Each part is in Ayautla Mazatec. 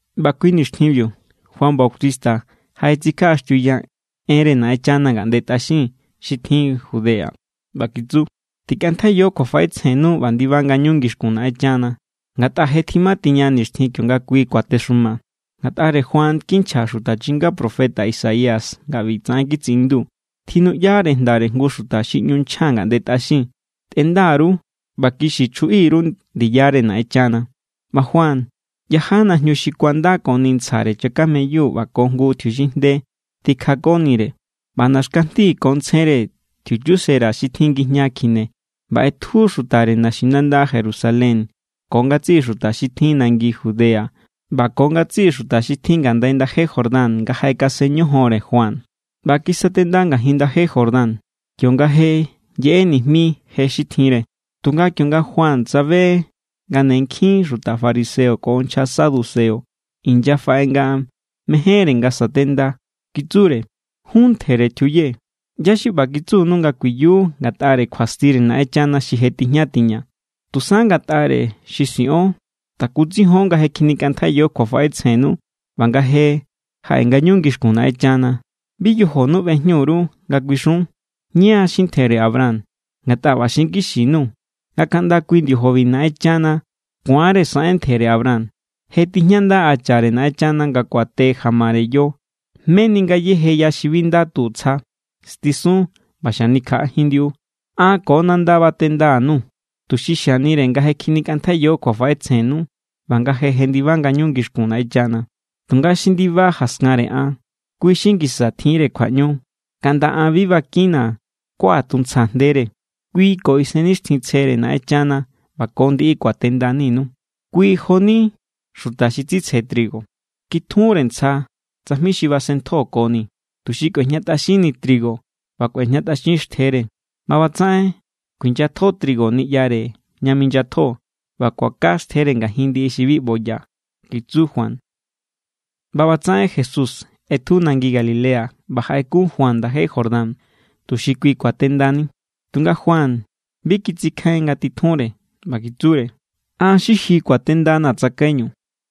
ꞌBa kui nixtjinbiu, Juan Bautista jaꞌetsikjaꞌaxtiuya enre Naꞌenchana ngaꞌnde tꞌaxin xi tjin Judea. ꞌBa kitsu: —Tikꞌantjaiyo kjuafaꞌetsjennu ꞌba ndiba ngañu ngixkun Naꞌenchana, ngatꞌa je tjimatiña nixtjin kionga kui kuatexuma. Ngatꞌare Juan kinchja xuta chinga profeta Isaías nga ꞌbitsaꞌen kitsiꞌindu: Tjinuꞌyare jndare jngu xuta xi ꞌñu nchja ngaꞌnde tꞌaxin: “Tꞌenda_ru ꞌba kixi chjuꞌi_ru ndiyare Naꞌenchana.” ꞌBa Juan yaja najñu xi kuandakoni ntsjare chakameyu ꞌba ko jngu tjiuxinjnde tikjakonire. ꞌBa naxkajndi ko ntsjenre tjiuchusera xi tjin ngijña kjine. ꞌBa ꞌetju xutare naxinanda Jerusalén ko ngatsiꞌi xuta xi tjin nangi Judea ꞌba ko ngatsiꞌi xuta xi tjin ngandai ndaje Jordán nga jaꞌekasen ñojonre Juan. ꞌBa kisatenda ngajin ndaje Jordán, kionga je yeꞌe nijmi je xi tjinre. Tunga kionga Juan tsabe nga ne nkjin xuta fariseo ko nchja saduceo inyafaꞌe nga mejénre nga satenda, kitsure: —Jun ntjere tjiuye, ¿ꞌyá= xi ꞌba kitsunu nga kuiyu ngatꞌare kjuastire Naꞌenchana xi je tijña tiña? Tusa ngatꞌare xi siꞌon takutsijion nga je kjinikꞌantjaiyo kjuafaꞌetsjennu ꞌba nga je jaꞌe ngañu ngixkun Naꞌenchana. Bi yojonu ꞌbejñujin_ru nga kuixiun: “Ña= xi ntjere Abraham.” Ngatꞌa ꞌba xinkixi_nuu̱ nga kaꞌnda kui ndiojobi Naꞌenchana ku̱anre saꞌen ntjere Abraham. Je tijñanda hachare Naꞌenchana nga kuate jamare yo. Meni ngayéje ya xi bi nda tu tsja, stisun ꞌba xanikjaꞌajin ndiꞌu. An ko nanda batenda_nuu̱ tuxi xianire nga je kjinikꞌantjaiyo kjuafaꞌetsjennu ꞌba nga je jendiba ngañu ngixkun Naꞌenchana. Tunga xi ndiba jaskanre an, kui= xi ngisa tjinre kjuaꞌñu, kaꞌnda an bi bakinna̱ kuaꞌatuntsjaa̱ jndere. Kui ko Isennixtjintsjere Naꞌenchana ꞌba ko ndiꞌi kuatendaninu. Kui jo=ni xuta xi tsitsje trigo. Kitjunre ntsja tsajmi xi basen ntjokoni, tuxi kꞌuejñatꞌaxinni trigo ꞌba kꞌuejñatꞌaxin xtjere. ꞌBa ꞌbatsaꞌen kuinyatjo trigo niꞌyare ña minyatjo, ꞌba kuaka xtjere ngajin ndiꞌi xi bi ꞌboya —kitsu Juan. ꞌBa ꞌbatsaꞌen Jesús ꞌetju nangi Galilea ꞌba jaꞌekun Juan ndaje Jordán, tuxi kui kuatendani. Tunga Juan bi kitsikjain nga titjunre ꞌba kitsure: —An= xi ji kuatendanaa̱ tsakaiñu.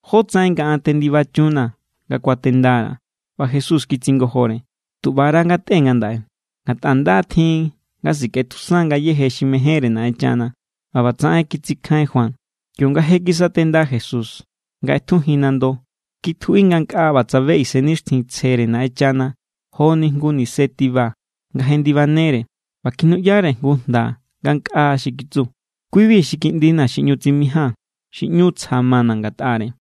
¿Jótsaꞌen nga an tendibachunnaa̱ nga kuatendara̱? ꞌBa Jesús kitsingojore: —Tu ꞌbara ngatꞌe ngandaꞌe, ngatꞌa nda= tjin nga sikꞌetjusan ngayéje xi mejénre Naꞌenchana. ꞌBa ꞌbatsaꞌen kitsikjain Juan. Kionga je kisatenda Jesús, nga ꞌetjujin nando, kitjuꞌi ngankꞌa ꞌba tsabe Isennixtjintsjere Naꞌenchana joni jngu nise tiba nga jendibajennere. ꞌBa kjinuꞌyare jngu jnda ngankꞌa xi kitsu: —Kui=bi xi Kiꞌndina̱ xi ꞌñu tsimijia̱n, xi ꞌñu tsja mana̱ ngatꞌare.